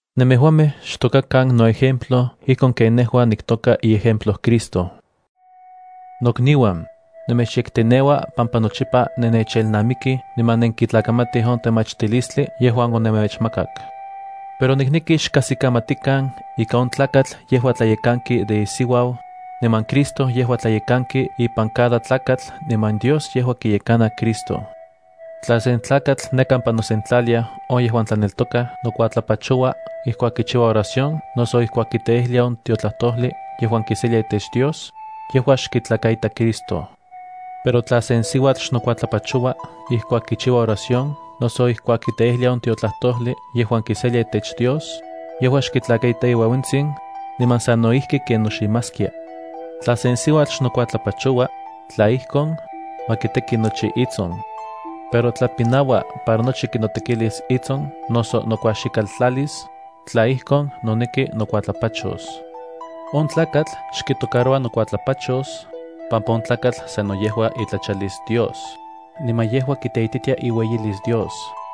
Nemejuamej xtokakan noejemplo ijkon ken nejua niktoka iejemplo Cristo. Nokniuan, nemechyekteneua pampa nochipa nennechelnamikij niman nenkitlakamatij on temachtilistli yejuan onemechmakak. Pero nikneki xkajsikamatikan ika on tlakatl yejua tlayekankia de isiuau, niman Cristo yejua tlayekanki ipan cada tlakatl niman Dios yejua kiyekana Cristo. Tla sen tlakatl ne kampa nosentlaliaj on yejuan tlaneltokaj nokuatlapachoua ijkuak kichiua oración noso ijkuak kiteijlia on tiotlajtojli yejuan kiselia itech Dios, yejua xkitlakaita Cristo. Pero tla sen siuatl xnokuatlapachoua ijkuak kichiua oración noso ijkuak kiteijlia on tiotlajtojli yejuan kiselia itech Dios, yejua xkitlakaita iueuentsin, niman sano ijki ken noximaskia. Tla sen siuatl xnokuatlapachoua, tla ijkon, ma kiteki nochi itson. Pero tla pinaua para nochi kinotekilis itson noso nokuaxikaltlalis, tla ijkon, noneki nokuatlapachos. On tlakatl xkitocaroua nokuatlapachos, pampa on tlakatl sano yejua itlachalis Dios, niman yejua kiteititia iueyilis Dios.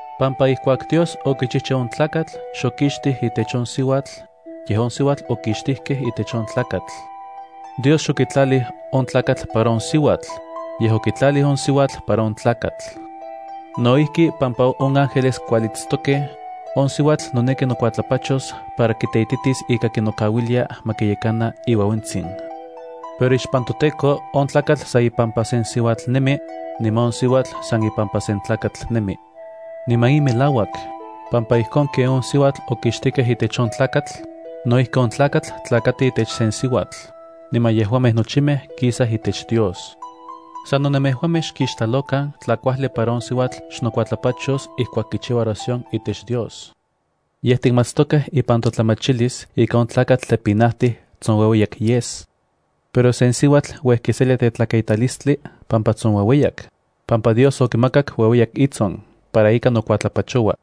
pampa ijkuak Dios okichichiu on tlakatl xokixtij itech on siuatl, yej on siuatl okixtijkej itech on tlakatl. Dios xokitlalij on tlakatl para on siuatl, yej okitlalij on siuatl para on tlakatl. No ijki pampa on ángeles kualitstokej, on siuatl noneki nokuatlapachos para kiteititis ika kinokauilia ma kiyekana iueuentsin. Pero ixpan toTEKO on tlakatl san ipampa sen siuatl nemi, niman on siuatl san ipampa sen tlakatl nemi. Niman in melauak, pampa ijkon ken on siuatl okixtijkej itech on tlakatl, no ijki on tlakatl tlakati itech sen siuatl, niman yejuamej nochimej kisaj itech Dios. Sano nemejuamej xkixtlalokan tla kuajli para on siuatl xnokuatlapachos ijkuak kichiuas oración itech Dios. Ye tikmatstokej ipan totlamachilis ika sen tlakatl pinauas tla tsonueueyak yes, pero sen siuatl uej kiselia tetlakaitalistli pampa tsonueueyak, pampa Dios okimakak ueueyak itson para ika nokuatlapachoua.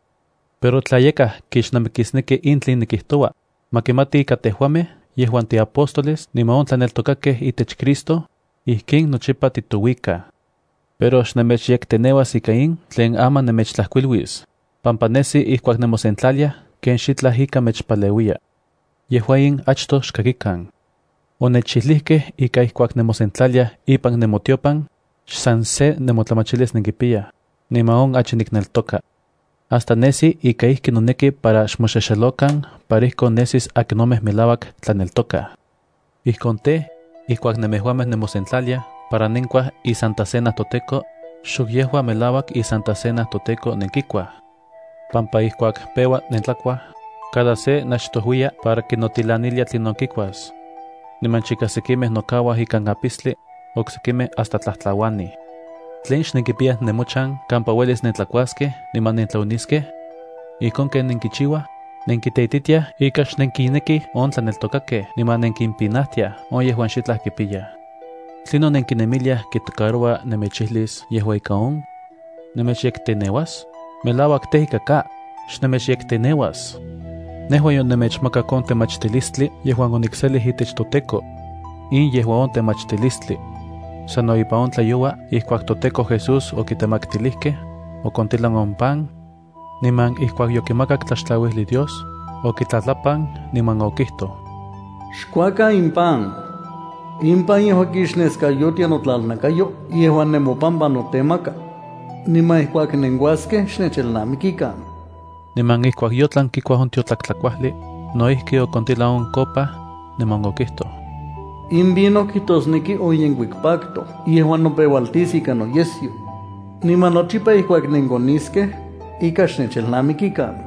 Pero tla yakaj kixnamikisneki in tlen nikijtoua, ma kimati ika tejuamej yejuan tiapóstoles niman on tlaneltokakej itech Cristo, ijkin nochipa titouikaj. Pero xnemechyekteneuas ika in tlen aman nemechtlajkuiluis, pampa nesi ijkuak nemosentlaliaj ken xitlaj ika mechpaleuiya. Yejua in achtoj xkakikan. Onechijlijkej ika ijkuak nemosentlaliaj ipan nemotiopan, xsan se nemotlamachilis nenkipiyaj, niman on achi nikneltoka. Hasta nesi ika ijki noneki para xmoxexelokan para ijkon nesis akinomej melauak tlaneltokaj. Ijkon tej, ijkuak nemejuamej nemosentlaliaj para nenkuaj iSanta Cena toTEKO, xok yejua melauak iSanta Cena toTEKO nenkikuaj, pampa ijkuak peua nentlakuaj, cada se nachtojuiya para kinotilanilia tlinon kikuas. Niman chika sekimej nokauaj ikan apistli, oksekimej hasta tlajtlauanij. ¿Tlen xnenkipiyaj nemochan kampa uelis nentlakuaskej niman nentlaoniskej? Ijkon ken nenkichiuaj, nenkiteititiaj ika xnenkinnekij on tlaneltokakej niman nenkimpinajtiaj on yejuan xitlaj kipiyaj. ¿Tlinon nenkinemiliaj kitocaroua nemechijlis yejua ika on? ¿Nemechyekteneuas? ¡Melauak tej, ika ka; xnemechyekteneuas! Nejua yonemechmakak on temachtilistli yejuan onikselij itech toTEKO. In yejua on temachtilistli. Sano ipan on tlayoua, ijkuak toTEKO Jesús okitemaktilijkej, okontilan on pan, niman ijkuak yokimakak tlaxtlauijli Dios, okitlatlapan, niman okijtoj: “Xkuakan in pan. In pan yejua kixneskayotia notlalnakayo yejuan nemopampa notemaka. Niman ijkuak nenkuaskej xnechelnamikikan.” Niman ijkuak yotlan kikuaj on tiotlak tlakuajli, no ijki okontilan on kopa, niman okijtoj: “In vino kijtosneki on yenkuik pacto yejuan nopeualtis ika noyesyo. Niman nochipa ijkuak nenkoniskej, ika xnechelnamikikan.”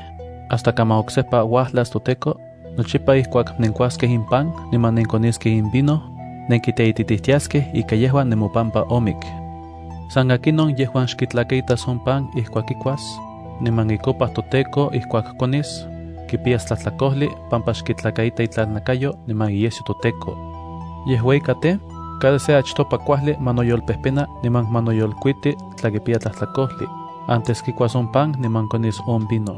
Hasta kaman toTEKO oksejpa uajlas, nochipa ijkuak nenkuaskej in pan niman nenkoniskej in vino, nenkiteititijtiaskej ika yejua nemopampa omik. San akinon yejuan xkitlakaitas on pan ijkuak kikuas, niman icopa toTEKO ijkuak konis, kipiyas tlajtlakojli pampa xkitlakaita itlalnakayo niman iyesyo toTEKO. Yejua ika tej, cada se achtopa kuajli ma noyolpejpena niman ma noyolkuiti tla kipiya tlajtlakojli antes kikuas on pan niman konis on vino.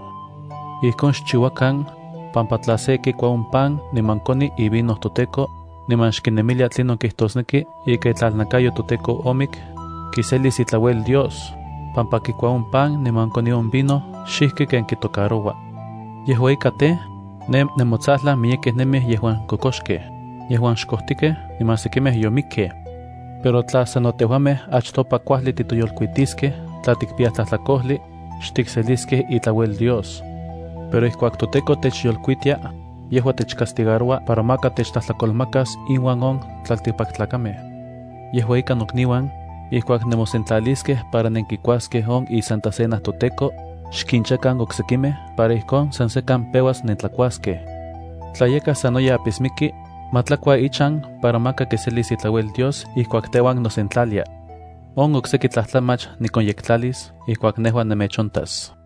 Ijkon xchiuakan, pampa tla se kikua on pan niman koni ivino toTEKO, niman xkinemilia tlinon kijtosneki ika itlalnakayo toTEKO omik, kiselis itlauel Dios, pampa kikua on pan niman koni on vino xijki ken kitocaroua. Yejua ika tej, ne nemotsajlan miyekej nemij yejuan kokoxkej, yejuan xkojtikej, niman sekimej yomikkej. Pero tla sano tejuamej achtopa kuajli titoyolkuiskej tla tikpiyaj tlajtlakojli, xtikseliskej itlauel Dios. Pero ijkuak toTEKO techyolkuitia, yejua techcastigaroua para maka techtlajtlakolmakas inuan on tlaltikpaktlakamej. Yejua ika nokniuan, ijkuak nemosentlaliskej para nenkikuaskej on iSanta Cena toTEKO, xkinchakan oksekimej para ijkon san sekan peuas nentlakuaskej. Tla yakaj sanoyej apismiki, ma tlakua ichan para maka kiselis itlauel Dios ijkuak teuan nosentlalia. On okseki tlajtlamach nikonyektlalis ijkuak nejua nemechontas.